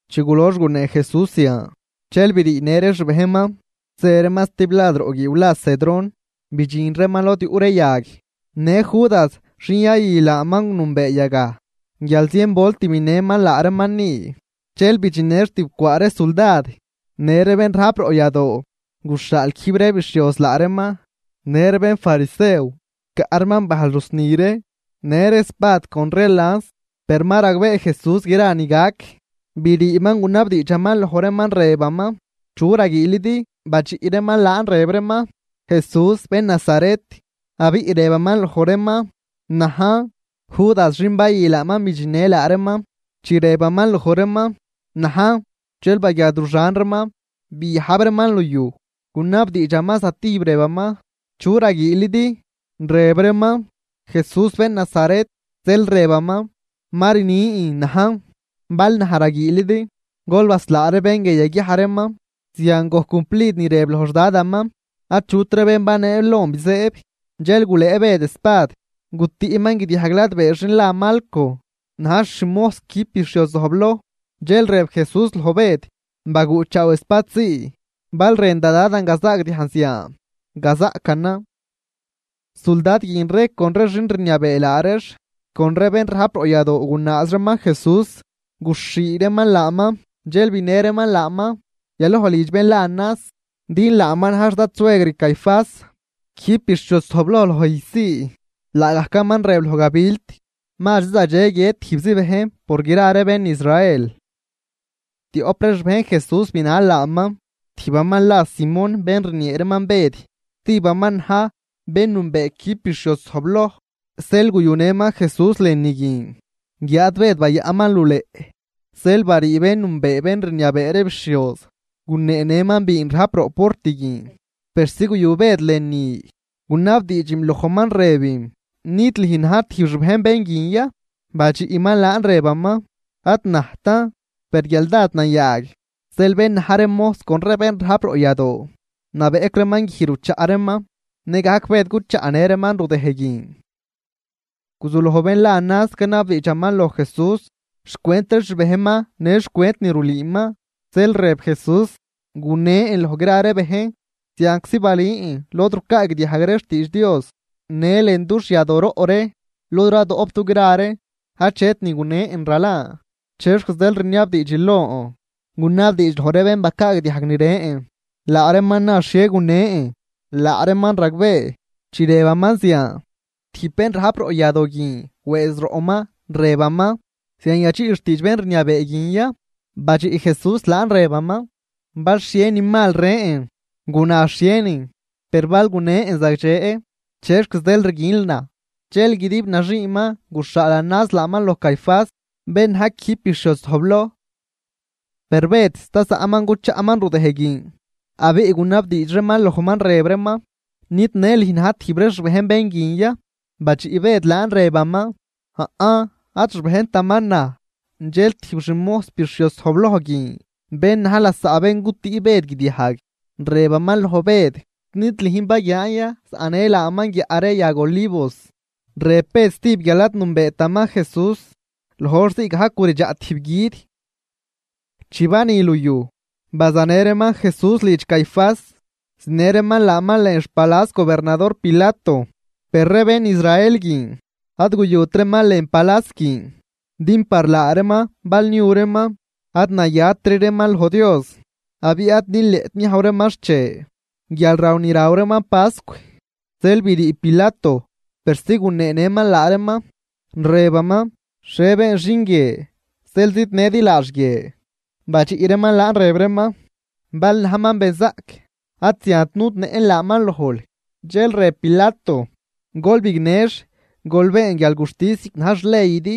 Chi gulox gunee Jesús zian, dxel briinë ree xbejnman, zë reeman stiblad roꞌ guiiw la Cedrón, bidxin reeman lod yuꞌ ree yag. Në Judas, xin yayü laaman, nünbee yagaj, guial zien volt binëman laa reeman ni. Zeel bidxinnëx tibcwaa ree suldad në ree bén rajp roꞌ yadoo, guxhaal quijb ree bixhioz laa reeman në ree bénfarisew, caꞌ reeman bajl rusni ree, në ree espad con ree lans. Per ma ragbee Jesús gra ni gac, briiman gunabdiidxaman loj reeman, rëbaman: ―¿Chu raguiilidi? Badxiꞌ reeman laan rëb reeman: ―Jesús bén Nazaret. Abiꞌ rëbaman loj reeman: ―Najn. Judas xin bayü laaman bidxinnë laa reeman. Chi rëbaman loj reeman: “Najn”, dxel baguiadruxan reeman biajb reeman luyuj. Gunabdiidxaman zatijb rëbaman: ―¿Chu raguiilidi? Rëb reeman: ―Jesús bén Nazaret. Zeel rëbaman: ―Ma rnin, najn. Bal naj raguiilidi, gol baslaa ree bén guie yaguiaj reeman. Zian gojc cumplid ni rëb loj xDadaman: “Achut ree bén baneel lon bizëëb.” Dxel gulëë Bëd espad, gutüꞌman guidiajg ladbee xin la Malco, najx xmojs quijb bixhioz zojbloj. Dxel rëb Jesús loj Bëd: ―Baguꞌchaaw espad zii. Bal rën da Dadan gazaagdiajn zian, gazaꞌcanan. Suldad guin ree con xin rniabee laa reex con ree bén rajp roꞌ yadoo gunaaz reeman Jesús, guxhii reeman laaman. Dxel binë reeman laaman yaloj lidx bén la Anás, din laaman na̱j xdadsuegr Caifás quijb bixhioz zojbloj loj ijz zii. Laagajcaman rëb loj gabilt, mazri zagdxe guiët tijbzi bejn por gra ree bén Israel. Tioꞌp ree xbejn Jesús binal laaman. Tijbaman la Simón, bén rniee reeman Bëd, stijbaman na̱j bén nünbee quijb bixhioz zojbloj, zeel guyunëman Jesús lënü guin, guiáad Bëd bayaꞌnman luleꞌ. Zeel barii bén nünbee bén rniabee ree bixhioz, guneenëman biin rajp roꞌ port guin, persi guyu Bëd lënü. Gunabdiidxim lojman rëbim: ―¿Nid lüjn na̱j tijb xbejn bén guin ya? Badxiꞌman laan rëbaman: ―Ad najtan. Per guial dád nayaag, zeel bén na̱j ree mojs con ree bén rajp roꞌ yadoo nabeꞌc reeman guij ruchaꞌ reeman. Nëgajc Bëd cuchaꞌnë reeman rudëj guin. Guzuloj bén la Anás canabdiidxaman loj Jesús xcwent ree xbejnman në xcwent ni rulüüman. Zeel rëb Jesús: ―Gunen loj gra ree bejn. Zianczi balün lod rucaagdiajg ree xtiidx Dios në lën dux yadooroꞌ ree, lod radoꞌp dugra ree. Achet ni gunen ralan. ¿Chexc zeel rniabdiidxil lon? Gunabdiidx loj ree bén bacaagdiajg ni rën, laa reeman na xhie gunen, laa reeman ragbee. Chi rëbaman zian, tijb bén rajp roꞌ yadoo guin wëëz roꞌman, rëbaman: ―¿Zian yadxiꞌl xtiidx bén rniabee guin ya? Badxiꞌ Jesús laan rëbaman: ―Bal xhie ni mal rën, guna xhienin. Per bal gunen zagdxe, ¿chexc zeel rguinl naj? Dxel guidib naxiiman guxhaal Anás laaman loj Caifás, bén na̱j quijb bixhioz zojbloj. Per Bëd sta zaꞌman cuchaꞌman rudëj guin. Abiꞌ gunabdiidx reeman lojman, rëb reeman: ―¿Nid në lüj na̱j tijb ree xbejn bén guin ya? Badxiꞌ Bëd laan rëbaman: ―Aꞌn, ad xbejntaman naj. Dxel tijb xmojs bixhioz zojbloj guin, bén na̱j lasaꞌ bén gutüꞌ Bëd guidiajg, rëbaman loj Bëd: ―¿Nid lüjn baguian ya zaꞌnël laaman guiaꞌ ree yag olivos? Rëb Bëd stijb guial ad nünbeetaman Jesús, loj hor zii gajc guridxaꞌ tijb gui̱d. Chi bani luyuj, bazanë reeman Jesús lidx Caifás, zinë reeman laaman lën xpalas gobernador Pilato. Per ree bén Israel guin ad guyut reeman lën palas guin, din par laa reeman bal niu reeman, ad nayatri reeman loj Dios, abiꞌ ad nileꞌt niajw reeman xche guialraw ni raw reeman pascw. Zeel brii Pilato persi guneenëman laa reeman, rëbaman: ―¿Xhie been xin guie zeel zidnëdi laax guie? Badxiꞌ reeman laan rëb reeman: ―Bal najman benzaꞌc, ad ziant nudnëꞌn laaman lojl. Dxel rëb Pilato: ―Gol bignëx, gol been guialguxtis ziꞌc na̱j xleydi.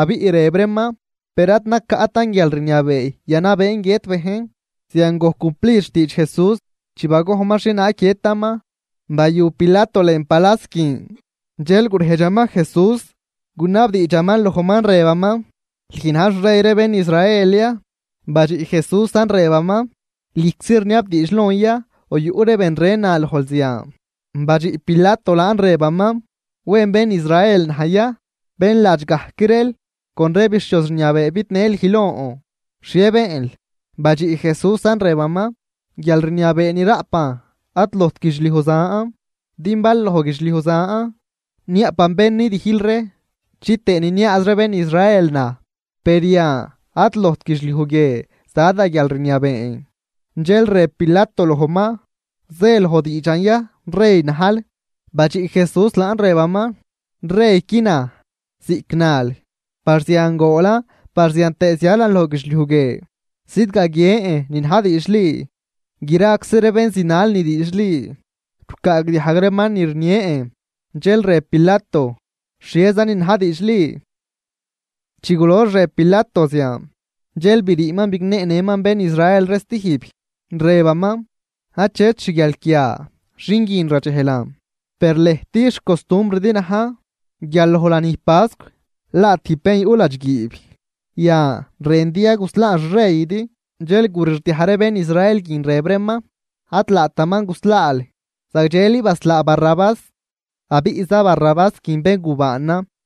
Abiꞌ rëb reeman: ―Per ad nacaꞌtan guialrniabee yanabeen guiët bejn. Zian gojc cumplid xtiidx Jesús chi bagojnman xhienaag guiëtaman. Bayu Pilato lën palas guin, dxel gurejdxaman Jesús, gunabdiidxaman lojman rëbaman: ―¿Lüj na̱j xrey ree bén Israel ya? Badxiꞌ Jesúsan rëbaman: ―¿Lüjczi rniabdiidx lon ya o yuꞌ ree ben ren na lojl zian? Badxiꞌ Pilato laan, rëbaman: ―¿Wen bén Israel naj ya? Bén ladx gajc reel con ree bixhioz rniabee bidnë lüj lon. ¿Xhie beenl? Badxiꞌ Jesúsan rëbaman: ―Guialrniabee ni raꞌpan ad lojt guidxliuj zan, din bal loj guidxliuj zan, niaꞌpan bén nidijl ree chitëë niniaaz ree ben Israel naj. Per yan ad lojt guidxliuj guie za da guialrniabeen. Dxel rëb Pilato lojman: ―¿Zë loj diidxan ya rey najl? Badxiꞌ Jesús laan rëbaman: ―Reyqui naj, ziꞌc nal. Par zian goolan par zian tëë zialan loj guidxliuj guie zidgaguien ni na̱j diidxli, graczi ree bén zinal ni diidxli rucaagdiajg reeman ni rnien. Dxel rëb Pilato: ―¿Xhiezanin na̱j diidxli? Chi gulox rëb Pilato zian, dxel briiman bigneenëman bén Israel ree stijb, rëbaman: ―Achet xguialquia xin guin radxejlan. Per lëjt, xcostumbridi na̱j guial loj lanij pascw laa tijb bén yuꞌ ladxguiib. Yan, ¿rëndi ya guslaan xreydi? Dxel gurixdiaj ree bén Israel guin, rëb reeman: ―¡Ad laataman guslaal! ¡Zagdxeli baslaa Barrabás! Abiꞌza Barrabás guin béngubaanan.